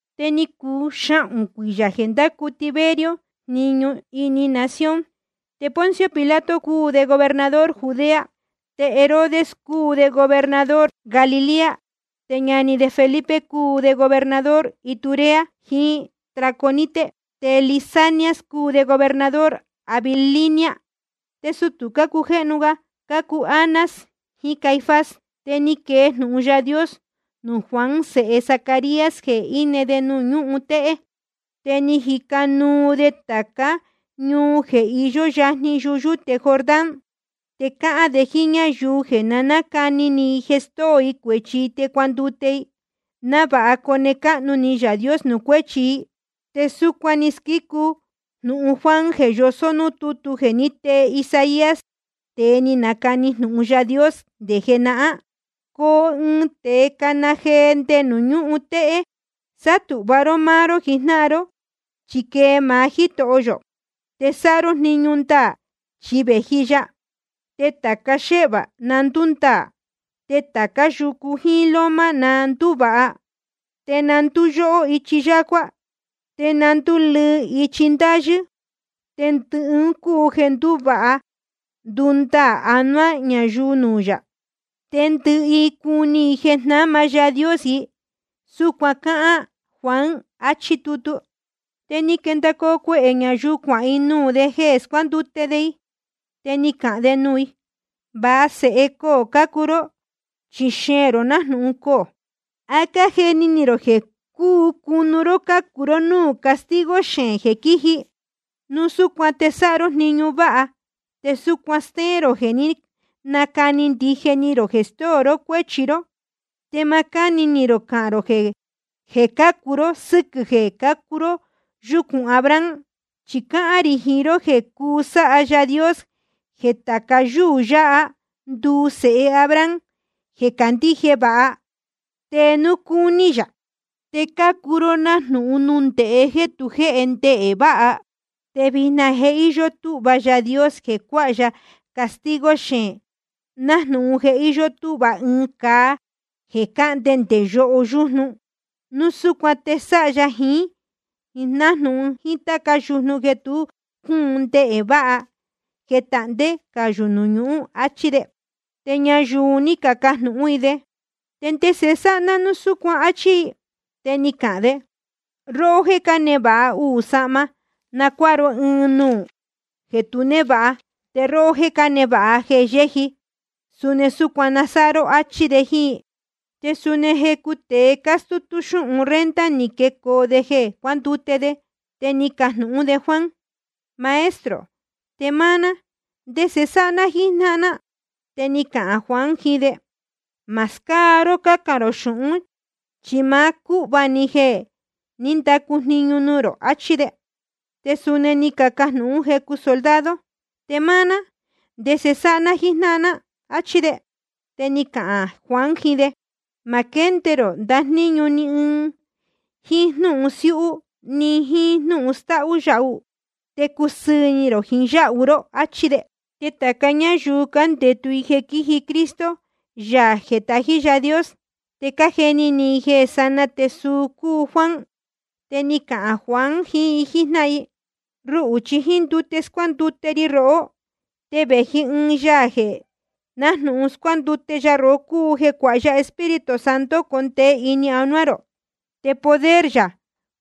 Te ni cuu xahūn cuiyā jeē ndácu Tiberio jniñu nɨ́ɨ́ nación. Te Poncio Pilato cúu de gobernador Judea, te Herodes cúu de gobernador Galilea, te ñani de Felipe cúu de gobernador Iturea jiín Traconite, te Lisanias cúu de gobernador Abilinia. Te sutū cujéhnu ga cácuu Anás jiín Caifás. Te ni quee jnūhun Yaā Dios nuū Juan sēhe Zacarías, jeē íne de nuū ñúhun téhé. Te ni jica nuu de tācá ñuu jeē iyó yajni yūte Jordán. Te cáhán de jíín ñáyuu jeē na nácani ni i jeē stóo i cuēchi i te cuandute i, návāha cone cáhnu ni Yaā Dios nuū cuéchi i. Te súcuan ni squícu jnūhun Juan jeē yosó nuū tútu ni tee Isaías, tēe ni nacani jnūhun Yaā Dios nde jenahán: Coo ɨɨn tēe cana jee nde nuū ñúhun téhé: Sátūhva ró máá ró jijnáhan ró, chi quee maá Jítoho yō. Te sáha ró jniñu ndaā, chi vēji ya. Te tāca xéhvā na ndúndaā, te tācá yucu jíín loma na ndúnduhvā, te na ndúyóhó ichi yácuá, te na ndúlɨɨ ichi ndáyɨ́. Te ndɨhɨ un cúu jeē ndúvāha ndundaā anuá ñayuu nuū yā. Te ndɨhɨ i cuni i jeē jnáma Yaā Dios i. Súcuan cahān Juan, achí tutu. Te ni quendacoo cuehē ñayuu, cuahān i nuū de jeē scuándute de i. Te ni cahān de nuū i: Va sēhe coō cácuu ró, chi xeēn rō nájnūhun coō. ¿A cájeni ni rō jeē cuu cunu ró cācu ró núū castigo xeēn jeē quíji? Núu súcuan te sáha ró jniñu váha, te súcuan stéén rō jeē ní nacani ndije ni rō jeē stóo ró cuéchi ró. Te ma cáni ni rō cahān rō jeē cuu cācu ró sɨ́quɨ̄ jeē cácuu ró yúcūn Abraham. Chi cáhán rī jiín ró jeē cuu sáha Yaā Dios jeē tāca yúū yáha nduu sēhe Abraham jeē candíje vāha, te núu cúní yā. Te cácuu ró nájnūhun nundēhé jeē tu jéhe ndehē váha. Te vijna je íyó túhva Yaā Dios jeē cuáha ya castigo xeēn, nájnūhun je íyó túhva ɨɨn cāa jeē cahnde nde yoho yujnu. Núu súcuan te sáha ya jiín ró nájnūhun jíín táca yujnu jeē tu cúun ndehē váha, jeē tahndé te cayū nuū ñuhún. Achí de. Te ñayuu un ní cacajnūhún i de: ¿Te ndese sáha ná núu súcuan? Achí i. Te ni cahān de: Róhó jéē cánevāha uū sahma, na cuáha ró ɨɨn nuū jeē tu névāha. Te róhó jéē cánevāha jeē yéji, suni súcuan na sáha ró, áchí de jíín i. Te suni jecu tēe cástútú xúhun renta, ni quecoo de jeē cuándute de. Te ni cacajnūhún de Juan: Maestro, te máá ná, ¿ndese sáha ná jíjnáhan ná? Te ni cahān Juan jiín de: Ma scaá ró cácān rō xūhún, chi máá cúhva‑ni jeē ní ndacu jniñu nuū rō, achí de. Te suni ni cacajnūhún jecu soldado: Te máá ná, ¿ndese sáha ná jíjnáhan ná? áchí de. Te ni cahān Juan jiín de: Ma quénde rō ndajníñu ni ɨɨn jíín jnúhun siúhú ni jíín jnúhun stáú yáhu, te cusɨɨ̄ ni rō jiín yáhu ró, áchí de. Te tāca ñáyuu cándetu i jeē quíji Cristo, Yaā jeē tají Yaā Dios, te cájeni ni i jeē sanaa te suu cúu Juan. Te ni cahān Juan jiín i jíjnáhan i: Ruhū chi jíín ndute scuándute ri rohó. Te vēji ɨɨn Yaā jeē nájnūhun scuándute ya rohó cúu jeē cuáha ya Espíritu Santo condee ini anuá rō, te poder yā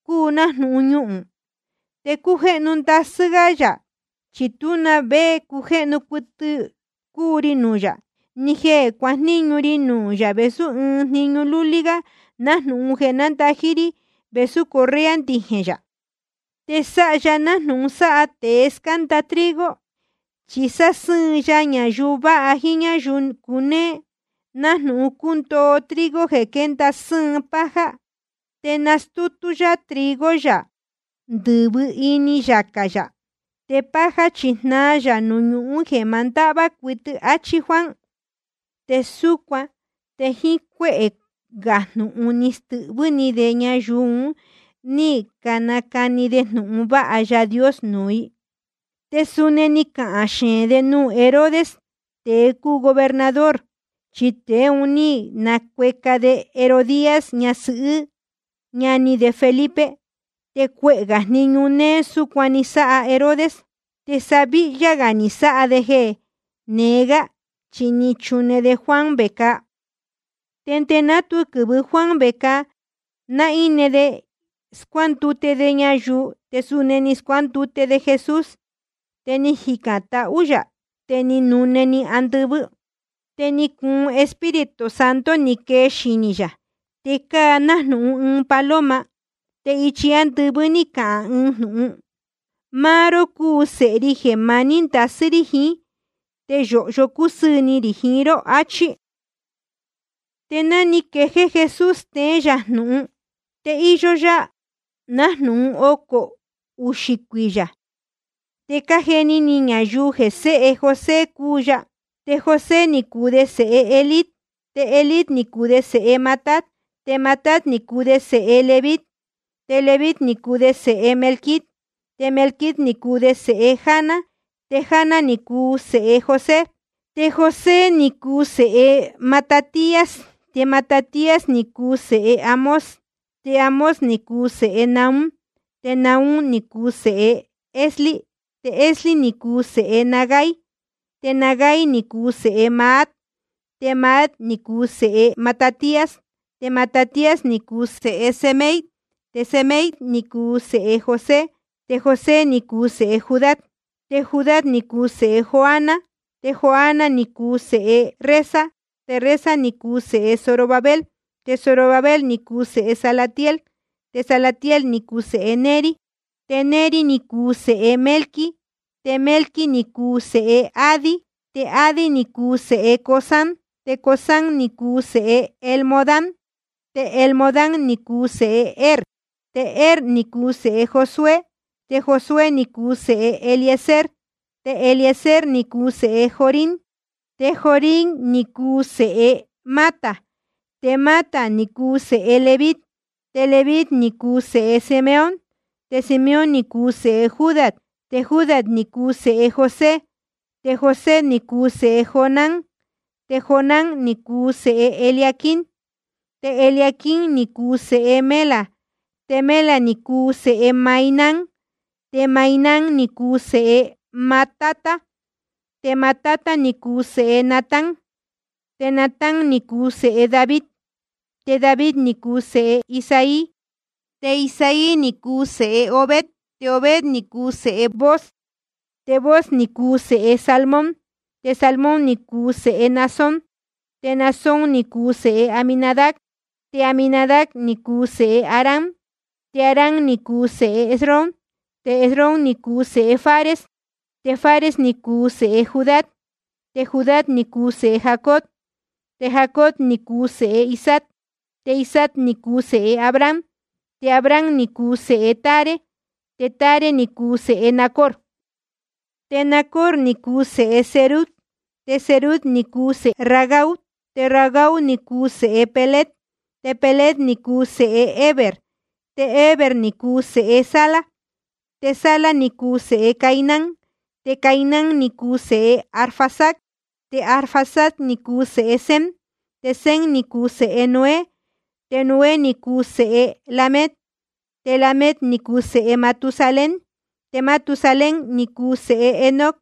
cúu nájnūhun ñuhūn. Te cújéhnu ndasɨ́ yá, chi tú na vé jéhnu cuɨtɨ cúu ri nuū yā, ni jeē cuajníñu ri nuū yā vēsú ɨɨn jniñu lúlí gá nájnūhun jeē ndají rí vēsú correa ndijēn yā. Te sáha ya nájnūhun sáha tēe scánda trigo, chi sásɨ́ɨn ya ñayuu vāha jíín ñáyuu cunéé, nájnūhun cúndoo trigo jeē quénda sɨ́ɨn paja. Te nastútú yá trigo yā ndɨ̄vɨ ini yacā yā. Te paja chi jnaa yā nuū ñuhún jeē ma ndahvá cuɨtɨ. Achí Juan. Te súcuan te jíín cuéhē gā jnūhun ni stɨhvɨ́ ni de ñayuu un, ní nacani de jnūhun vāha Yaā Dios nuū i. Te suni ni cahān xeēn de nuū Herodes, tēe cúu gobernador, chi tēe un ní nacueca de Herodías, ñasɨhɨ́ ñani de Felipe. Te cuehē gā jniñu néé súcuan ni sáha Herodes. Te sa víhyá gā ni sáha de jeē neé gá, chi ni chune de Juan vecāa. Te nde ná tu quɨ̄vɨ Juan vecāa, ná ni ine de ni scuándute de tāca ñáyuu, te suni ni scuándute de Jesús. Te jícán tahú yā, te ni nune‑ni andɨvɨ́. Te ni cuun Espíritu Santo ni quee xinī yā, te cáa nájnūhun ɨɨn paloma. Te ichi ándɨvɨ́ ní cahān ɨɨn jnūhun: Máá ró cúu Sēhe ri jeē maní ndasɨ́ rí jiín, te yōhyo cúsɨɨ̄ ni rī jiín ró, achí. Te ná ni quejéé Jesús steén yā jnūhun, te íyó yá nájnūhun ocō uxī cuiyā. Te cájeni ni ñayuu jeē séhe José cúu ya. Te José ni cuu sēhe Elí, te Elí ni cuu sēhe Matat, te Matat ni cuu sēhe Leví, te Leví ni cuu sēhe Melqui, te Melqui ni cuu sēhe Jana, te Jana ni cuu sēhe José, te José ni cuu sēhe Matatías, te Matatías ni cuu sēhe Amós, te Amós ni cuu sēhe Nahum, te Nahum ni cuu sēhe Esli, te Esli ni cuu sēhe Nagai, te Nagai ni cuu sēhe Maat, te Maat ni cuu sēhe Matatías, te Matatías ni cuu sēhe Semei, te Semei ni cuu sēhe José te José ni cuu sēhe Judá, te Judá ni cuu sēhe Joana, te Joana ni cuu sēhe Resa, te Resa ni cuu sēhe Zorobabel, te Zorobabel ni cuu sēhe Salatiel, te Salatiel ni cuu sēhe Neri, te Neri ni cuu sēhe Melqui, te Melqui ni cuu sēhe Adi, te Adi ni cuu sēhe Cosam, te Cosam ni cuu sēhe Elmodam, te Elmodam ni cuu sēhe Er, te Er ni cuu sēhe Josué, te Josué ni cuu sēhe Eliezer, te Eliezer ni cuu sēhe Jorim, te Jorim ni cuu sēhe Matat, te Matat ni cuu sēhe Leví, te Leví ni cuu sēhe Simeón, te Simeón ni cuu sēhe Judá, te Judá ni cuu sēhe José, te José ni cuu sēhe Jonán, te Jonán ni cuu sēhe Eliaquim, te Eliaquim ni cuu sēhe Melea, te Melea ni cuu sēhe Mainán, te Mainán ni cuu sēhe Matata, te Matata ni cuu sēhe Natán, te Natán ni cuu sēhe David, te David ni cuu sēhe Isaí, te Isaí ni cuu sēhe Obed, te Obed ni cuu sēhe Booz, te Booz ni cuu sēhe Salmón, te Salmón ni cuu sēhe Naasón, te Naasón ni cuu sēhe Aminadab, te Aminadab ni cuu sēhe Aram, te Aram ni cuu sēhe Esrom, te Esrom ni cuu sēhe Fares, te Fares ni cuu sēhe Judá, te Judá ni cuu sēhe Jacob, te Jacob ni cuu sēhe Isaac, te Isaac ni cuu sēhe Abraham, te Abraham ni cuu sēhe Taré, te Taré ni cuu sēhe Nacor, te Nacor ni cuu sēhe Serug, te Serug ni cuu sēhe Ragau, te Ragau ni cuu sēhe Peleg, te Peleg ni cuu sēhe Heber, te Heber ni cuu sēhe Sala, te Sala ni cuu sēhe Cainán, te Cainán ni cuu sēhe Arfaxad, te Arfaxad ni cuu sēhe Sem, te Sem ni cuu sēhe Noé, te Noé ni cuu sēhe Lamec, te Lamec ni cuu sēhe Matusalén, te Matusalén ni cuu sēhe Enoc,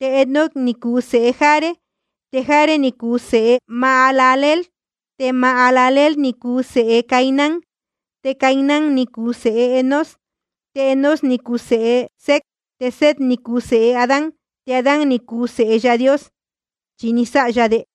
te Enoc ni cuu sēhe Jared, te Jared ni cuu sēhe Mahalaleel, te Mahalaleel ni cuu sēhe Cainán, te Cainán ni cuu sēhe Enós, te Enós ni cuu sēhe Set, te Set ni cuu sēhe Adán, te Adán ni cuu sēhe Yaā Dios, chi ni sáha ya de.